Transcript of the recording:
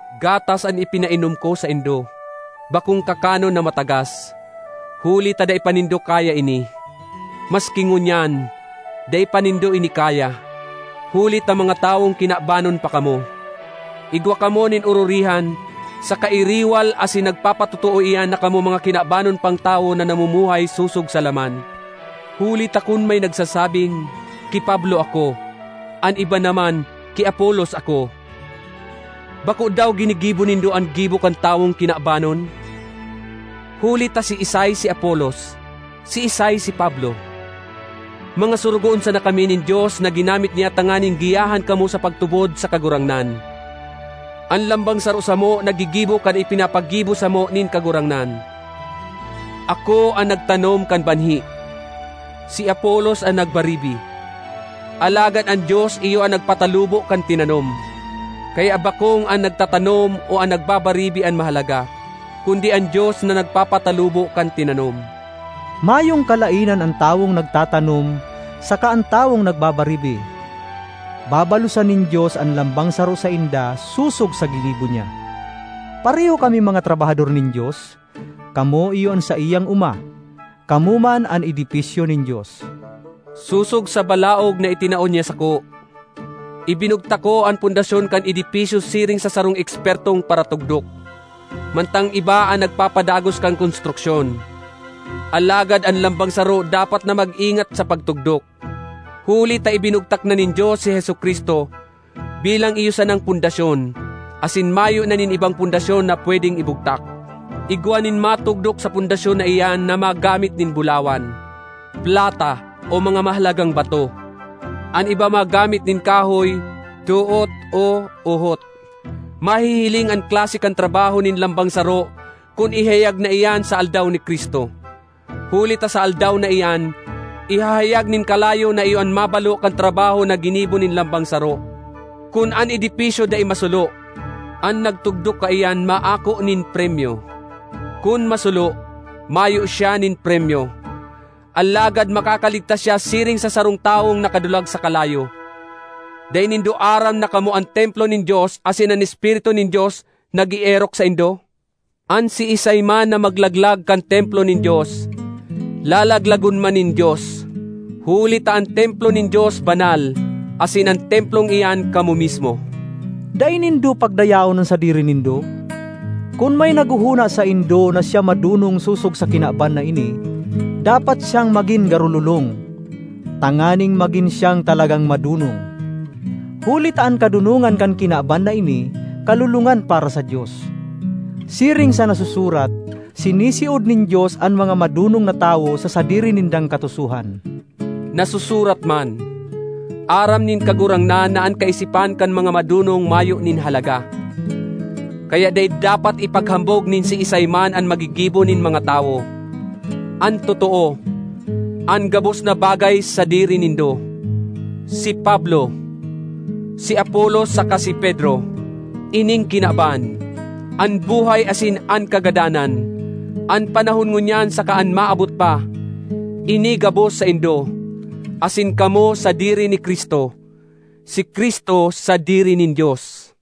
Gatas an ipinainom ko saindo, bakong kakanon na matagas, huli ta dai pa nindo kaya ini. Maski ngunyan, dai pa nindo ini kaya, huli ta mga tawong kinabanon pa kamo. Igwa kamo nin ororihan saka iriwal asin nagpapatotoo iyan na kamo mga kinabanon pang tawo na namumuhay sosog sa laman. Huli ta kun may nagsasabing, “Ki Pablo ako,” an iba naman, “Ki Apolos ako”—bako daw ginigibo nindo an gibo kan tawong kinabanon? Huli ta siisay si Apolos? Siisay si Pablo? Mga sorogoon sana kami nin Dios na ginamit niya tanganing giyahan kamo sa pagtubod sa Kagurangnan. An lambang saro samo naggigibo kan ipinapagibo samo nin Kagurangnan: ako an nagtanom kan banhi, si Apolos an nagbaribi, alagad an Dios iyo an nagpatalubo kan tinanom. Kaya bakong an nagtatanom o an nagbabaribi an mahalaga, kundi an Dios na nagpapatalubo kan tinanom. Mayong kalaenan an tawong nagtatanom saka an tawong nagbabaribi; babalosan nin Dios an lambang saro sainda sosog sa ginibo niya. Pareho kaming mga trabahador nin Dios; kamo iyo an saiyang oma. Kamo man an edipisyo nin Dios. Sosog sa balaog na itinao niya sako, ibinugtak ko an pundasyon kan edipisyo siring sa sarong ekspertong paratugdok, mantang iba an nagpapadagos kan konstruksyon. Alagad an lambang saro dapat na mag-ingat sa pagtugdok. Huli ta ibinugtak na nin Dios si Jesu-Cristo bilang iyo sanang pundasyon, asin mayo na nin ibang pundasyon na pwedeng ibugtak. Igwa nin matugdok sa pundasyon na iyan na magamit nin bulawan, plata, o mga mahalagang bato; an iba magamit nin kahoy, doot o uhot. Mahihiling an klase kan trabaho nin lambang saro kun ihayag na iyan sa Aldaw ni Cristo; huli ta sa Aldaw na iyan, ihahayag nin kalayo na iyo an mabalo kan trabaho na ginibo nin lambang saro. Kun an edipisyo dai masulo, an nagtugdok kaiyan maako nin premyo. Kun masulo, mayo siya nin premyo; alagad makakaligtas siya siring sa sarong tawong nakadulag sa kalayo. Dai nindo aram na kamo an templo nin Dios asin an Espiritu nin Dios nag-eerok saindo? An siisay man na maglaglag kan templo nin Dios, lalaglagon man nin Dios; huli ta an templo nin Dios banal, asin an templong iyan kamo mismo. Dai nindo pagdayaon an sadiri nindo. Kun may naghohona saindo na siya madonong sosog sa kinaban na ini, dapat siyang magin garo lolong, tanganing magin siyang talagang madonong. Huli ta an kadonongan kan kinaban na ini, kalolongan para sa Dios. Siring sa nasusurat, “Sinisiod nin Dios an mga madonong na tawo sa sadiri nindang katusohan.” Nasusurat man, “Aram nin Kagurangnan na an kaisipan kan mga madonong mayo nin halaga.” Kaya dai dapat ipaghambog nin siisay man an magigibo nin mga tawo. An totoo, an gabos na bagay sadiri nindo: si Pablo, si Apolos saka si Pedro; ining kinaban, an buhay asin an kagadanan, an panahon ngunyan saka an maabot pa—ini gabos saindo. Asin kamo sadiri ni Cristo; si Cristo sadiri nin Dios.